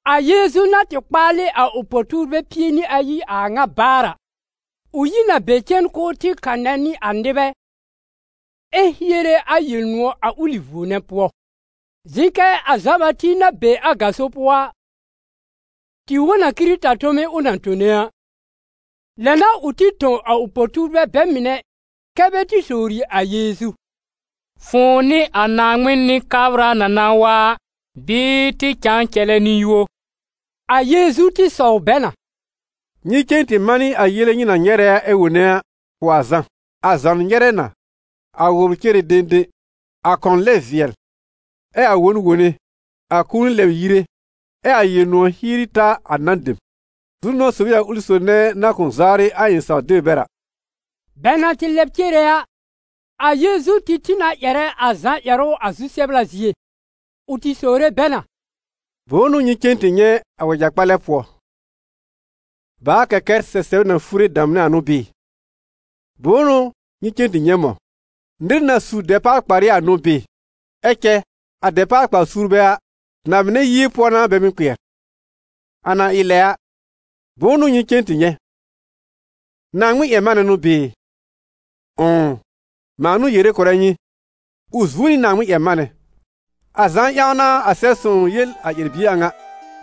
A Yeezu na tɩ kpaalɩ a ʋ po-tuurbɛ pie nɩ ayi a a ŋa baar a, ʋ yi n a be cen k'ʋʋ tɩ kanɛ nɩ a nɩbɛ ɛ hiere a Yel-nʋ̃ɔ̀ a ʋlɩ vuo nɛ pʋɔ. Zɩ̃ kɛ a Zã-Bati na be a gaso pʋɔ a, tɩ wõ n a Kɩrɩta tome ʋ na tone a. Lɛ n'a ʋ tɩ tõ a ʋ po-tuurbɛ bɛ mɩnɛ kɛ́ bɛ tɩ sowri a Yeezu: «Fʋ̃ʋ n'ɩ a Naaŋmɩn Nɩ-kabra na na wa a, bɩɩ tɩ cãa cɛlɛ nɩ-yũo?» A Yeezu tɩ sɔw bɛ na: «Nyɩ cen tɩ manɩ a yele nyɩ na nyɛrɛ ɛ wone a, kʋ̀ a Zã: a zɔn nyɛrɛ na, a wʋbr cere dẽdẽ, a kɔn lɛb vɩɛl, ɛ a won wone, a kũuni lɛbr yire, ɛ a Yel-nʋ̃ɔ̀ hieri ta a nan dem. Zu-nʋ̃ɔ̀ sob n'ɩ a ʋlɩ sob nɛ na kʋ̃ zawrɩ a ɩ̃ saw-deb bɛr a.» Bɛ na tɩ lɛb cere a, a Yeezu tɩ tĩ na ƴɛrɛ a Zã ƴɛrʋ a zu-sɛbla zie. Ʋ tɩ sowre bɛ na: «Bʋ̃ʋ n'ʋ nyɩ cen tɩ nyɛ̃ a wɛja-kpalɛ pʋɔ? Bàa-kɛkɛr sɛsɛb na fure damnɛ a n'ʋ bɩɩ? Bʋ̃ʋ n'ʋ nyɩ cen tɩ nyɛ̃ mɔ̃? Nɩr na su dɛpaal-kparɩ a n'ʋ bɩɩ? Ɛ cɛ a dɛpaal-kpar-suurbɛ a, na-mɩnɛ yie pʋɔ n'a bɛ mɩ́ kpɩɛr. A na ɩ lɛ a, bʋ̃ʋ n'ʋ nyɩ cen tɩ nyɛ̃? Naaŋmɩn-ƴɛr-manɛ n'ʋ bɩɩ? Ʋ̃ʋ, mãa n'ʋ yere kʋ̀rɛ nyɩ, ʋ zuo nɩ Naaŋmɩn-ƴɛr-manɛ. A Zã ƴãw n'a a Sɛb-sõw yel a ƴɛr-bie a ŋa: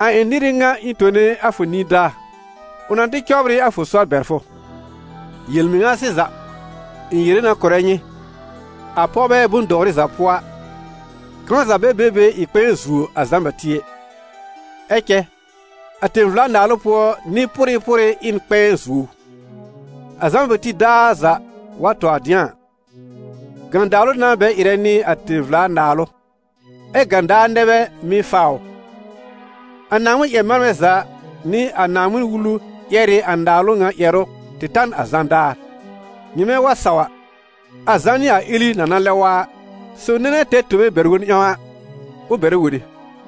‹A ɩ̃ nɩr ɩ ŋa ɩ̃ tone a fʋ nidaa, ʋ na tɩ cɔbr ɩ a fʋ sɔr bɛr fʋ.› Yel-mɩŋa sɩza, ɩ̃ yere na kʋ̀rɛ nyɩ, a pɔwbɛ bʋ̃-dɔwrɩ za pʋɔ a, kãw za bɛ be be ɩ kpɛ̃ɛ zuo a Zã-Bati ɛ, ɛ cɛ a tẽ-vla-naalʋ pʋɔ nɩ-pʋrɩ pʋrɩ ɩ n kpɛ̃ɛ zuo ʋ. A Zã-Bati daar za wa tɔ dɩ̃a a, gãdaalʋ n'a bɛ ɩrɛ nɩ a tẽ-vla-naalʋ, ɛ́ gãdaar nɛ bɛ mɩ́ faa ʋ. A Naaŋmɩn-ƴɛr-manbɛ za nɩ a Naaŋmɩn-Wulu ƴɛr ɩ a Naalʋ ŋa ƴɛrʋ tɩ ta n a Zã daar; nyɩmɛ wa saw a, a Zã n'ɩ a Eli na na lɛb wa a. Sob nɛ na tɛr tobe bɛr-wob ƴãw a, ʋ bɛrɛ wone!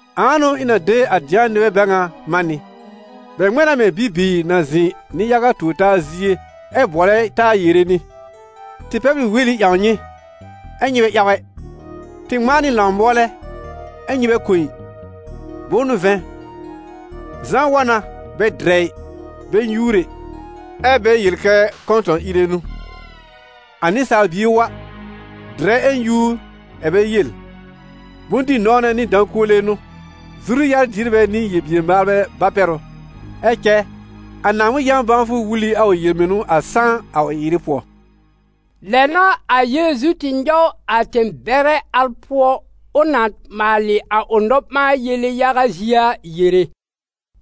Ãa n'ʋ ɩ̃ na de a dɩ̃a nɩbɛ bɛ ŋa man nɩ? Bɛ ŋmɛ̃ na mɛ̃ bibiir na zɩ̃ nɩ-yaga tuor-taa zie ɛ bʋɔlɛ taa yere nɩ: ‹Tɩ pɛbl ɩ weli ƴãw nyɩ, ɛ́ nyɩ bɛ ƴaw ɛ! Tɩ ŋmãa nɩ lãw-mʋɔlɛ, ɛ́ nyɩ bɛ kõ ɩ!› Bʋ̃ʋ n'ʋ vɛ̃, Zã wa na, bɛ dɩrɛ ɩ, bɛ nyúur ɛ, ɛ́ bɛ yel kɛ: ‹Kɔ̃tɔ̃-ìre n'ʋ!› A Nɩsaal Bie wa, dɩrɛ ɛ nyúur, ɛ bɛ yel: ‹Bʋ̃-dɩ-nɔ̃wnɛ nɩ dã-kuole n'ʋ, zuru-yar-dierbɛ nɩ yel-bier-maalbɛ ba-pɛr ʋ!› Ɛ cɛ a Naaŋmɩn yã-bãwfʋ wul ɩ a ʋ yel-mɩnʋ a sãá a ʋ ɩ-ɩrɩ pʋɔ.» Lɛ n'a a Yeezu tɩ nyɔw a tẽ-bɛrɛ al pʋɔ ʋ na maalɩ a ʋ nɔ-ɓãa-yele yaga zie a yere,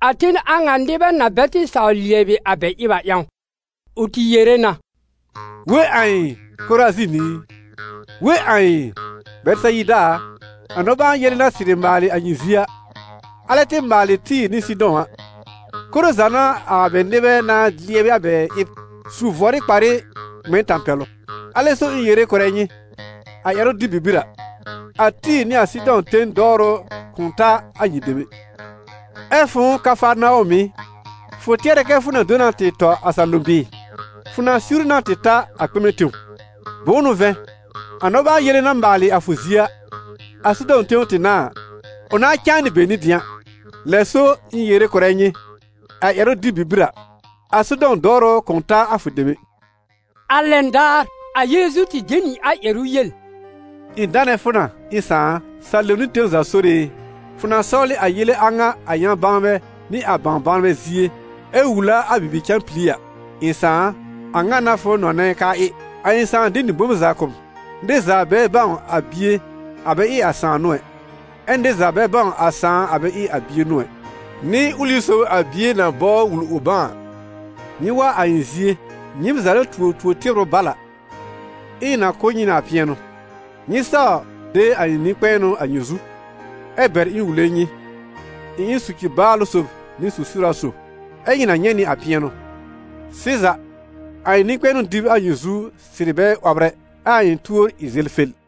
a ten a ŋa nɩbɛ na bɛ tɩ saw lɩɛbɩ a bɛ ɩb a ƴãw. Ʋ tɩ yere na: «We ãi, Korazin i! We ãi, Bɛtɩsayida a! A nɔ-ɓãa-yele na sɩrɩ maalɩ a nyɩ zie a, alɛ tɩ maalɩ Tɩ́ɩ̀r nɩ Sɩdɔ̃ a, koro za n'a a bɛ nɩbɛ nãá lɩɛbɩ a bɛ ɩb, su vʋɔrɩ kparɩ ŋmɛ n tãpɛlʋ. Alɛ so ɩ̃ yere kʋ̀rɛ nyɩ, a ƴɛrʋ-dɩb bibir a, a Tɩ́ɩ̀r nɩ a Sɩdɔ̃ ten dɔwrʋ kʋ̃ ta a nyɩ dem ɛ. Ɛ fʋ̃ʋ Kafarnawɔm ɩ, fʋ tɩɛrɛ kɛ fʋ na do na tɩ tɔ a salom bɩɩ? Fʋ na siwri na tɩ ta a kpɩmɛ tẽw. Bʋ̃ʋ n'ʋ vɛ̃, a nɔ-ɓãa-yele na maalɩ a fʋ zie a, a Sodɔm tẽw tɩ n'a a, ʋ nãá cãa nɩ be nɩ dɩ̃a. Lɛ so, ɩ̃ yere kʋ̀rɛ nyɩ, a ƴɛrʋ-dɩb bibir a, a Sodɔm dɔwrʋ kʋ̃ ta a fʋ dem ɛ.» A lɛn daar, a Yeezu tɩ de nɩ a ƴɛrʋ yel: «Ɩ̃ danɛ fʋ na, ɩ̃ Sãà a, salom nɩ tẽw za Sore e, fʋ na sɔwlɩ a yele a ŋa a ƴã-bãwnbɛ nɩ a bãw-bãwnbɛ zie, ɛ wul a a bibi-cãpili a. Ɩ̃ Sãà a, a ŋa n'a fʋ nɔnɛ k'aa ɩ.» A ɩ̃ Sãà de nɩ bom za kʋ̀ m. Nɩr za bɛ bãw a Bie a bɛ ɩ a Sãà n'ʋ ɛ, ɛ nɩr za bɛ bãw a Sãà a bɛ ɩ a Bie n'ʋ ɛ, nɩ ʋlɩ sob a Bie na bɔbr wul ʋ bãw a. Nyɩ wa a ɩ̃ zie, nyɩɩm za na tuo to-tɩbrʋ bal a, ɛ ɩ̃ na kʋ̀ nyɩ nɩ a pɩɛnʋ. Nyɩ saw de a ɩ̃ nɩ-kpɛ̃ɛnʋ a nyɩ zu, ɛ bɛr ɩ̃ wule nyɩ, ɩ̃ ɩ n soci-baalʋ sob nɩ su-siwra sob, ɛ nyɩ na nyɛ̃ nɩ a pɩɛnʋ. Sɩza, a ɩ̃ nɩ-kpɛ̃ɛnʋ dɩb a nyɩ zu sɩrɩ bɛ 'wɔbr ɛ, ɛ a ɩ̃ tuor ɩ zelfel.